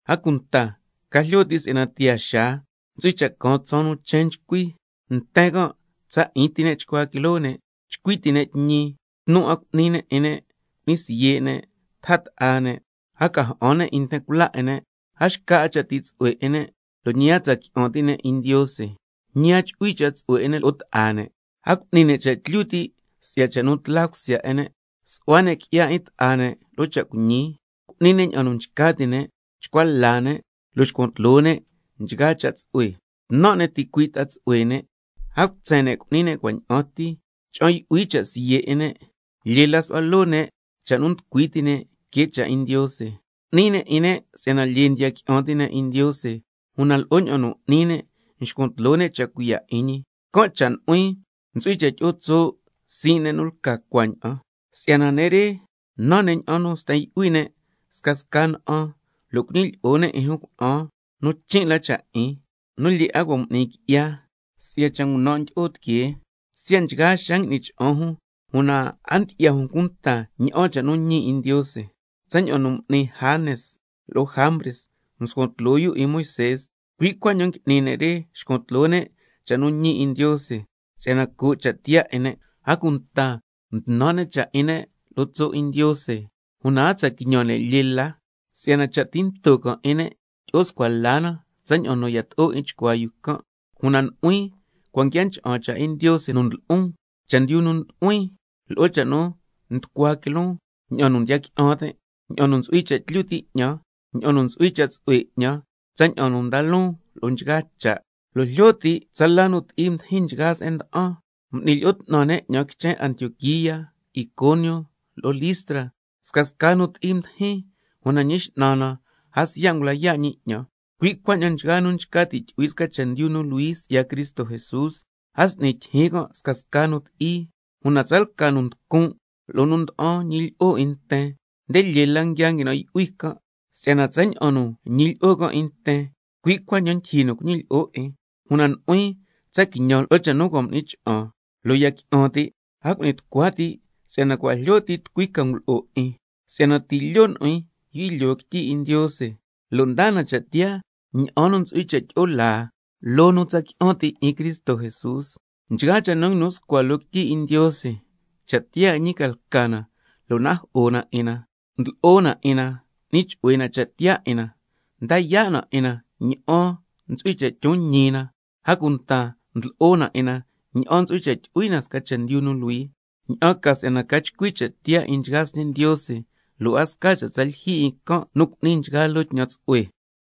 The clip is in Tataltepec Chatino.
A cunta ca jlyo ti' si'yana tiyaa xaa ntsu'hui cha' caan tsaan nu chen nchcui. Nten can' tsa 'in ti ne' chcua quiloo ne', chcui ti' ne' tñi, tnu 'a cu'ni ne' 'in ne', cu'ni siye' ne', taja ta'a ne', a ca ja'an 'a ne' 'in nten cula 'in ne', a xca 'a cha' ti' tsu'hue 'in ne', lo' ñi a tsa qui'an 'a ti' ne' 'in Ndiose, ñi a chu'hui cha' tsu'hue 'in ne' lo'o ta'a ne', a cu'ni ne' cha' tlyu ti' si'ya cha' nu tla cusya 'in ne', su'hua ne' qui'ya 'in ta'a ne' lo'o cha' cuiñi, cu'ni ne' ña'an nu nchca ti' ne', chcua la ne', lo' xcuan tloo ne' nchgaa cha' tsu'hue, tnan' ne' ticuii' ta'a tsu'hue ne', a cutsen ne' cu'ni ne' cua' ña'an ti, cha'an yu'hui cha' siye' 'in ne', lyee la su'hua loo ne' cha' nu nducui ti' ne' que cha' 'in Ndiose, cu'ni ne' 'in ne' si'yana lyee ndiya qui'an ti' ne' 'in Ndiose, una lo'o ña'an nu n'ni ne' nxcuan tloo ne' cha' cuiya' 'in ñi. Can' cha' nu'huin ntsu'hui cha' tyi'o tso' sii' ne' nu lca cuaña'an. Si'yana ne' re nan ne' ña'an sten yu'hui ne' scasca na'an, lo' cuñilyi'o ne' 'in jun cuna'an nu chin' la cha' 'in, nu lyee 'a cua' m'ni qui'ya si'ya cha' ngunan' ndyi'o tiquee. Siya' nchgaa xaa ngui'ni cha'an jun, una a ndyi'ya jun cunta ña'an cha' nu ñi 'in Ndiose. Tsaña'an nu m'ni Janes lo'o Jambres mscuan tloo yu 'in Moisé, cui' cuaña'an ngui'ni ne' re nxcuan tloo ne' cha' nu ñi 'in Ndiose, si'yana coo' cha' tiyaa 'in ne', a cunta mtnan' ne' cha' 'in ne' lo'o tso' 'in Ndiose. Una a tsa quiñan ne' lyee la, si'yana cha' tinto can' 'in ne' tyi'o scua la na tsaña'an yato'o 'in chcuaa yu can'. Una nu'huin cua' nguia ncha'an cha' 'in Ndiose nu ndlo'on, chendyu nu ndu'huin, lo'o cha' nu nducua quiloon, ña'an nu ndiya qui'an tin', ña'an nu ntsu'hui cha' tlyu ti' 'ñan, ña'an nu ntsu'hui cha' tsu'hue 'ñan, tsaña'an nda loon nchgaa loo cha', lo' jlyo ti' tsala nu ti'i mdijin nchgaa se'en mda'an, jui nu mducui ncha'an 'ñan quichen Antioquía, Iconio lo'o Listra, scasca nu ti'i mdijin, una Ñi X'nan na, a siya' ngula yaa' ñi 'ñan. Cui' cuaña'an nchgaa nu nchca ti' tyu'hui sca chendyu nu luhui si'ya Cristo Jesús, a s'ni tyijyin can' scasca nu ti'i. Una tsalca nu nducun' lo'o nu nda'an ñilyi'o 'in nten, nde lyee la nguia nguinan' yu'hui can', si'yana tsaña'an nu ñilyi'o can' 'in nten, cui' cuaña'an ndyijyi nu cuñilyi'o 'in. Una nu'huin tsa quiñan lo'o cha' nu cua' m'ni cha'an lo' ya qui'an ti', a cu'ni tucua ti' si'yana cua' jlyo ti' tucui ca ngulo'o 'in. Si'yana ti' lyo' nu'huin yu'hui lyoo quityi 'in Ndiose, lo' ndaa na cha' tiyaa ña'an nu ntsu'hui cha' tyi'o laa loo nu tsa qui'an ti' 'in Cristo Jesús. Nchgaa cha' nu nguinu scua loo quityi 'in Ndiose, cha' tiyaa 'in ñi ca lca na lo' najo'o na 'in na, ndlo'o na 'in na, n'ni chu'hue na cha' tiyaa 'in na, nda yaa' na 'in na ña'an ntsu'hui cha' tyon ñi na, a cunta ndlo'o na 'in na ña'an ntsu'hui cha' tyu'hui na sca chendyu nu luhui, ña'an ca si'yana ca chcui cha' tiyaa 'in nchgaa sñe' Ndiose, lo' a sca cha' tsa lyijyi 'in can' nu cu'ni nchgaa loo tñan tsu'hue.